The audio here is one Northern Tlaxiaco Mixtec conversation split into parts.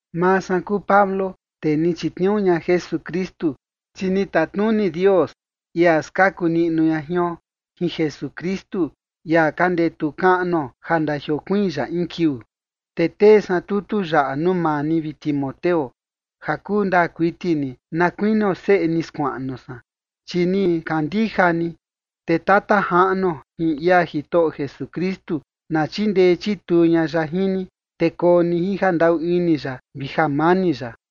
Maa san kuu Pablo, tee ni chitniuu ña Jesukristu, chi ni tatnuni Dios, ia skaku niꞌnu ña jion, jin Jesukristu, ia ka ndetu kaꞌnuo ja ndajiokuiin ya in kiuu. Te tee san tutu yaꞌa nuu maa ni, vi Timoteo, ja kuu ndaa kuiti ni na kuinio seꞌe ni skuaꞌnu san, chi ni kandija ni. Te Tata Jaꞌnuo jin ia Jitoꞌo Jesukristu na chindee chituu ña ya jin ni, te koo ni jin jandaꞌu ini ya vi jamani ya.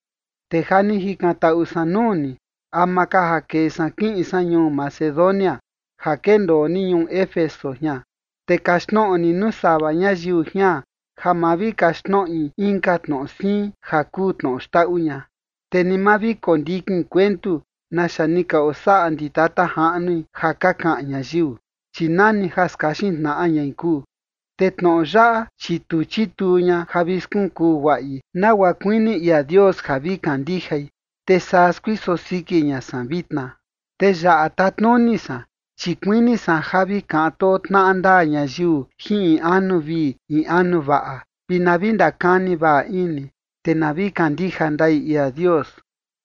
Te ja ni jikantaꞌu san nuu ni ama ka ja kee san kiꞌin san ñuu Macedonia ja kendoo ni ñuu Éfeso jian, te kaxtnoꞌo ni nuu sava ñayiu jian ja ma vi kaxtnoꞌi inka tnoꞌo siin ja kuu tnoꞌo xndaꞌu ña. Te ni ma vi kondikin kuentu naxa ni ka osaꞌa ndi tata jaꞌnui ja ka kaꞌan ñayiu, chi nani ja skaxin tnaꞌa ñai kuu. Te tnoꞌo yaꞌa, chi tu chituu ña ja vi skunkuu guaꞌi nagua kuini ia Dios ja vi kandijai, te saa skuiso siki ña san vitna. Te yaꞌa tatnuni san, chi kuini san ja vi kaꞌan too tnaꞌa ndaa ñayiu jin in anu vii in anu vaꞌa, vi na vi ndakani vaꞌa ini, te na vi kandija ndai ia Dios.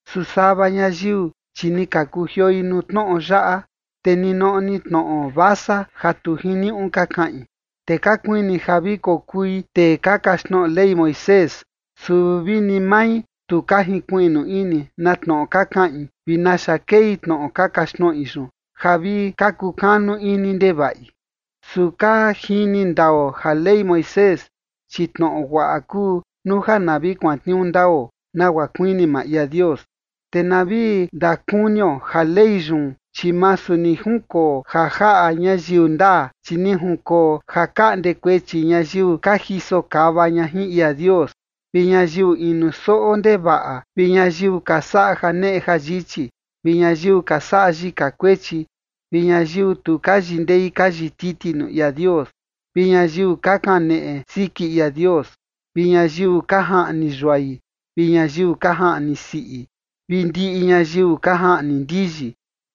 Su sava ñayiu, chi ni ka kujioi nuu tnoꞌo yaꞌa, te ni noꞌo ni tnoꞌo vasa ja tu jiniuꞌu ka kaꞌin. Te ka kuini ja vi kokui tee ka kaxtnoꞌo Ley Moisés, su vi ni mai tu ka jinkuiꞌnu ini na tnoꞌo ka kaꞌin vi naxa kei tnoꞌo ka kaxtnoꞌi yun ja vi ka kukanu ini ndevaꞌi. Su ka jini ndao ja Ley Moisés, chi tnoꞌo guaꞌa kuu nuu ja na vi kuantniuu ndao nagua kuini maa ia Dios. Te na vi ndakunio ja Ley yun, chi masu ni junkoo ja jaꞌa ñayiu ndaa, chi ni junkoo ja kaꞌnde kuechi ñayiu ka jiso kava ña jin ia Dios, vi ñayiu inu soꞌo ndevaꞌa, vi ñayiu ka saꞌa janeꞌe jayichi, vi ñayiu ka saꞌa yika kuechi, vi ñayiu tu ka yindei ka yititi nuu ia Dios, vi ñayiu ka kaneꞌe siki ia Dios, vi ñayiu ka jaꞌni yuai vi ñayiu ka jaꞌni siꞌi, vi ndiꞌi ñayiu ka jaꞌni ndiyi,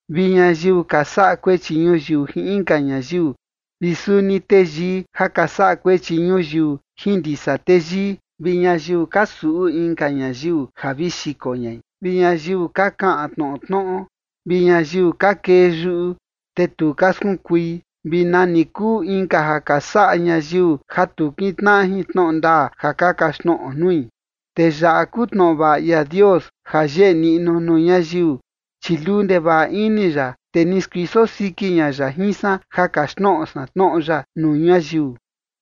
vi ñayiu ka saꞌa kuechi ñuyiu jin inka ñayiu, vi suni teyii ja ka saꞌa kuechi ñuyiu jin ndisa teyii, vi ñayiu ka suꞌu inka ñayiu ja vi xiko ñai, vi ñayiu ka kaꞌan tnoꞌo tnoꞌo, vi ñayiu ka kee yuꞌu te tu ka skunkui, vi nani kuu inka ja ka saꞌa ñayiu ja tu kintnaꞌa jin tnoꞌo ndaa ja ka kaxtnoꞌo nui. Te yaꞌa kuu tnoꞌo vaꞌa ia Dios ja yeꞌe niꞌnu nuu ñayiu, chi luu ndevaꞌa ini ya, te ni skuiso siki ña ya jin san ja kaxtnoꞌo san tnoꞌo ya nuu ñayiu.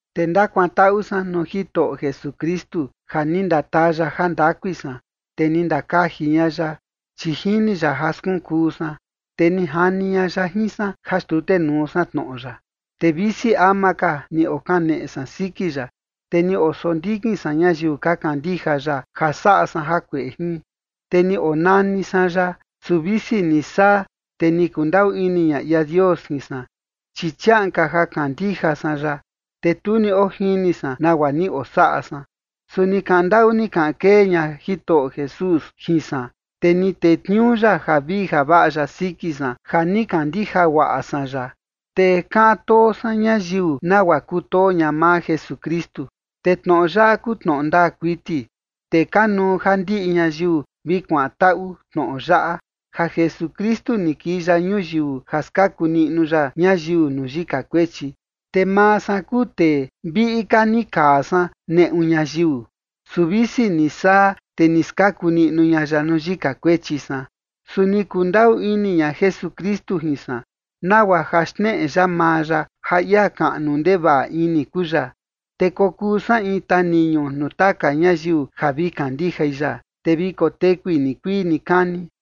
Te ndakuantaꞌu san nuu Jitoꞌo Jesukristu ja ni ndataa ya jandakui san, te ni ndakaji ña ya, chi jini ya ja skunkuu san, te ni jani ña ya jin san ja xtutenuu san tnoꞌo ya. Te visi ama ka ni okaneꞌe san siki ya, te ni osondikin san ñayiu ka kandija ya ja saꞌa san jakueꞌe jin, te ni onani san ya. Su visi ni saa, te ni kundaꞌu ini ña ia Dios jin san, chi chiaꞌan ka ja kandija san ya, te tu ni ojini san nagua ni osaꞌa san. Su ni kaꞌan ndaꞌu ni kaꞌan kee ña Jitoꞌo Jesús jin san, te ni tetniuu ya javii javaꞌa ya siki san ja ni kandija guaꞌa san ya, te kaꞌan too san ñayiu nagua kutoo ña maa Jesukristu. Te tnoꞌo yaꞌa kuu tnoꞌo ndaa kuiti, te kanuu ja ndiꞌi ñayiu vi kuantaꞌu tnoꞌo yaꞌa: ja Jesukristu ni kii ya ñuyiu ja skaku niꞌnu ya ñayiu nuu yika kuechi. Te maa san kuu tee viꞌi ka ni kaa san neꞌu ñayiu. Su visi ni saa, te ni skaku niꞌnu ña ya nuu yika kuechi san. Su ni kundaꞌu ini ña Jesukristu jin san nagua ja xneꞌe ya maa ya ja ia kaꞌnu ndevaꞌa ini kuu ya, te kokuu san in taniñu nuu taka ñayiu ja vi kandijai ya, te vi kotekui nikuii nikani.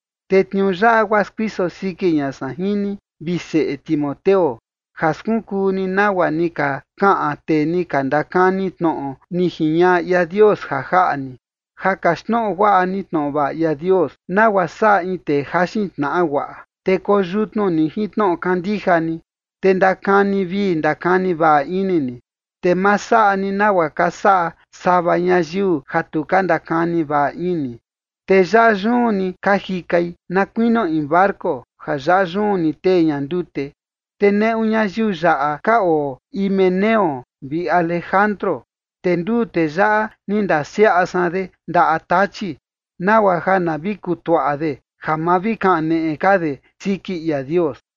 Te tniuu yaꞌa guaa skuiso siki ña san jin ni, vi seꞌe Timoteo, ja skunkuu ni nagua ni ka kaꞌan tee ni ka ndakani tnoꞌo ni jiñaꞌa ia Dios ja jaꞌa ni, ja kaxtnoꞌo guaꞌa ni tnoꞌo vaꞌa ia Dios, nagua saꞌa in tee jaxin tnaꞌa guaꞌa. Te koyutnu ni jin tnoꞌo kandija ni, te ndakani vii ndakani vaꞌa ini ni, te ma saꞌa ni nagua ka saꞌa sava ñayiu ja tu ka ndakani vaꞌa ini, te yaꞌa yun ni ka jikai, na kuinio in barco ja yaꞌa yun ni tee ña ndute. Te neꞌu ñayiu yaꞌa ka oo Himeneo vi Alejandro, te nduu tee yaꞌa ni ndasiaꞌa san de ndaꞌa Tachi, nagua ja na vi kutuaꞌa de ja ma vi kaneꞌe ka de siki ia Dios.